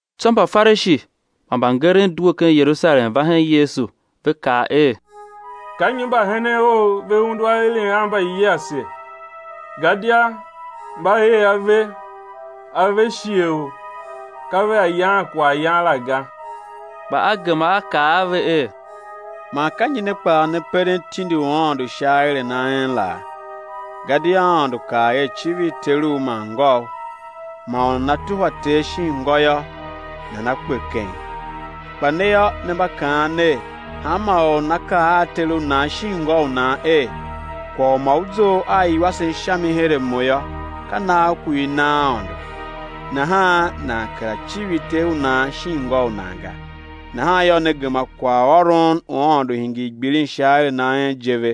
Tsô Mbafarishi man mbangeren due ken Yerusalem va hen Yesu, ve kaa er: Ka nyi mbahenen Ou ve undu aeren a mbayiase, gadia mba ee ave a ve shighe u ka vea yaan kwaghyan la ga. Kpa A gema A kaa a ve er: Man ka nyi ne kpaa ne peren tindi u Aôndo sha aeren a en laa? Gadia Aôndo kaa er: Civir teru man ngôu; man u nana tuhwa ter shin ngô yô, nana kpe keng. Kpa ne yô, ne mba kaan ner: Hanma or u nana kaa a ter u nan shin ngô u u nan er: Kwagh u ma u zough a iwasen sha mi her a mo yô, ka nagh ku i na Aôndo; nahan nan kera civir ter u nan shin ngô u nan ga. Nahan yô, ne gema kwaghôron u Aôndo hingir gbilin sha aeren a en je ve.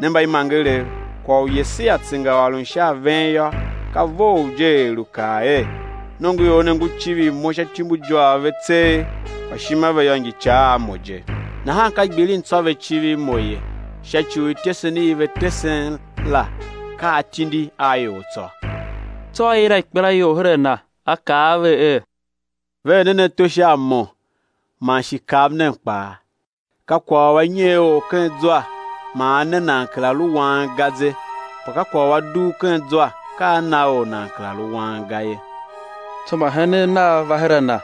Ne mbaimangerev, kwagh u Yesaia tsengaôron sha a ven yô, ka vough je, er lu kaa er: Nongoior ne ngu civir Mo sha ityumbujôôgh ve tseegh, kpa ishima ve yô, ngi ica a Mo je. Nahan ka gbilin tsô ve civir Mo, sha ci u ityesen i ve tesen la ka atindi a ior tsô. Tsô a yila ikpelaior her a Na A kaa a ve er: Ver nen ato her a Mo man shi kav nen kpaa. Ka kwagh u a nyer or ken zwa man a ne nan kera lu wang ga ze. Kpa ka kwagh u a dugh ken zwa, ka a na or nan kera lu wang ga ye. Tsô mbahenen Nav va her a Na,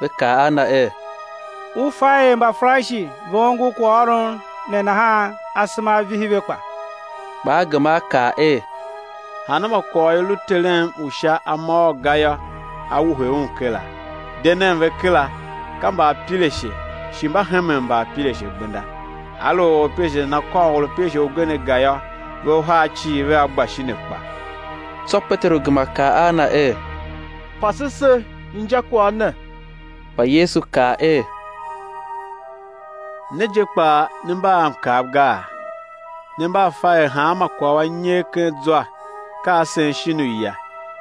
va kaa a Na er: U fa er Mbafarishi ve ongo kwaghôron ne nahan, asema a vihi ve kpa? Kpa A gema A kaa er: Hanma kwagh u i lu Terem u Sha a môôr ga yô, á wuhe un kera. De nen ve kera; ka mbaapirashe shi mba hemen mbaapirashe gbenda. Aluer orapirashe nana kôr orapirashe ugen aga yô, ve uhar cii vea gba shin akpa. Tsô Peteru gema kaa a Na er: Pase se injakwagh ne. Kpa Yesu kaa er: Ne je kpaa, ne mba a mkav gaa? Ne mba a fa er hanma kwagh u a nyer ken zwa, ka a sen shin uya,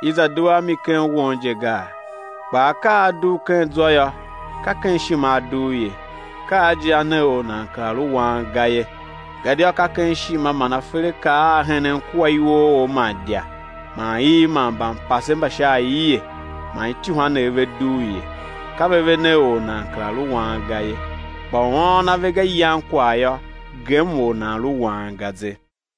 i za due a mi ken won je gaa? Kpaa akaa a a dugh ken zwa yô, ka ken ishima a dugh ye, ka a je, a ne or nan kera lu wang ga ye. Gadia ka ken ishima man aferakaa a henen kua iwooor man idya man iv man mbampase mba sha aie man ityuhwanev ve dugh ye. Ka ve ve ne or nan kera lu wang ga ye; kpa u ôôn ave ga, yan kwagh yô, gem or nan lu wang ga ze.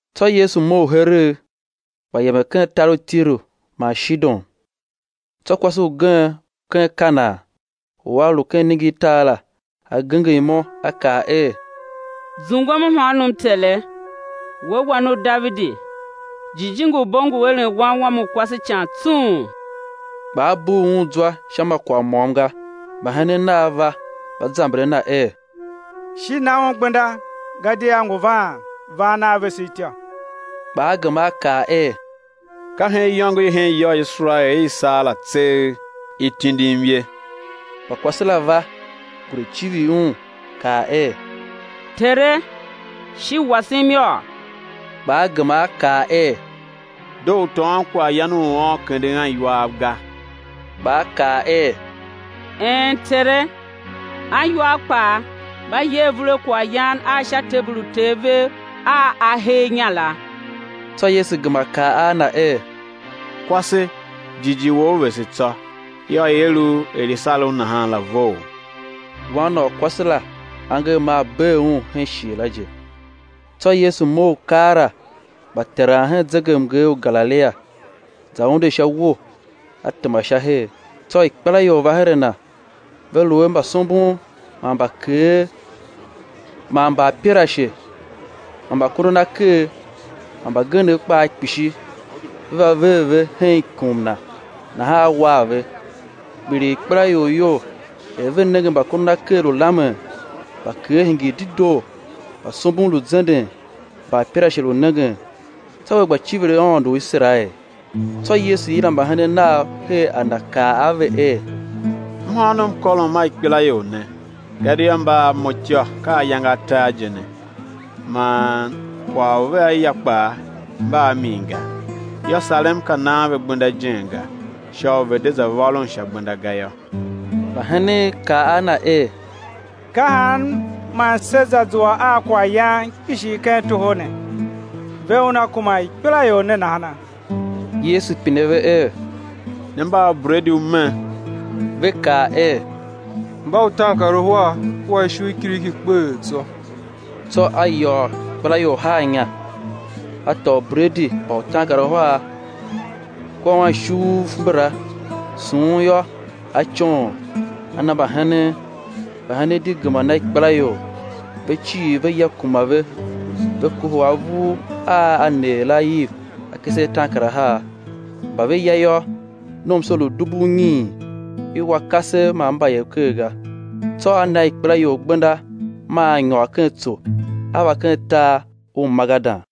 Tsô Yesu mough heregh, gba yemen ken tar u Tiru man Shidon. Tsô kwase ugen u ken Kanaan u a lu ken iningirtar la, a genger imo, a kaa er: Zungwem mhôônom Tere, We Wan u Davidi, jijingi u bo ngu eren wan wam u kwase ican tsung. Kpa A bugh un zwa sha ma kwagh môm ga. Mbahenen Nav va, va zamber a Na er: Shi na un gbenda, gadia ngu vaan, van a vese ityô. Kpa A gema A kaa er: Ka hen iyôngo i hen ya u Iserael i i saa la tseegh i tindim ye. Kpa kwase la va, gure civir Un, kaa er: Tere, shi wasem yôô! Kpa A gema A kaa er: Doo u tôôn kwaghyan u uôn, kenden aniwaav ga. Kpa a kaa er: Een, Tere, aniwaav kpaa mba ye avur a akaayan a sha tebul u uter vev a a hee inya la. Tsô Yesu gema kaa a na er: Kwase, jighjigh wou vese tsô; yô, i̱ er u er i sar u nahan la vough. Wan na u kwase la angev maa bee un hen shighe la je. Tsô Yesu mough keela, gba teran hen zegemnger u Galilia; za unde sha uwo, A tema sha her. Tsô ikpelaior va her a Na, ve lu a mbasombon man mbakeer man mbaapirashe man mbakondonaker, man mbagenev kpaa kpishi, ve va ver ve hen ikum Na nahan A war ve; kpiligh ikpelaior iyol, er ve nenge mbakondonaker lu lamen, mbakeer hingir dedoo, mbasombon lu zenden, mbaapirashe lu nengen; tsô ve gba civir Aôndo u Iserael. Tsô Yesu yila mbahenen Nav her a Na kaa a ve er: Mhôônom kôrom a ikpelaior ne, gadia mba a Mo ityô ka ayange atar je ne, man kwagh u vea ya kpaa, mba a min ga: yô, sarem pe nan ve gbenda ijen ga, sha u ve̱ de za vôron sha gbenda ga yô. Mbahenen kaa a Na er: Ka han man sé za zua a kwaghyan kpishi ken toho ne, ve una kuma imbaikpelaior ne nahana? Yesu pine ve er: Ne mba a ubredi u me? Ve kaa er: Mba utaankaruhar kua ishu i kiriki kpeghee tsô. Tsô A yôô ikpelaior haa inya. A tôô ubredi mba utaankaruhar kua anishuuv mbala, sughun yô, A coon, A na mbahenen; mbahenen di gema na ikpelaior. Ve cii ve ya kuma ve; ve kohol avur a a neer la iv akese ataankarahar Mba ve ya yô, nomso lu dubu unyiin, i wa kasev man mbayev ker ga. Tsô A na ikpelaior gbenda; maa A nyôr ken tso, A va ken tar u Magadan.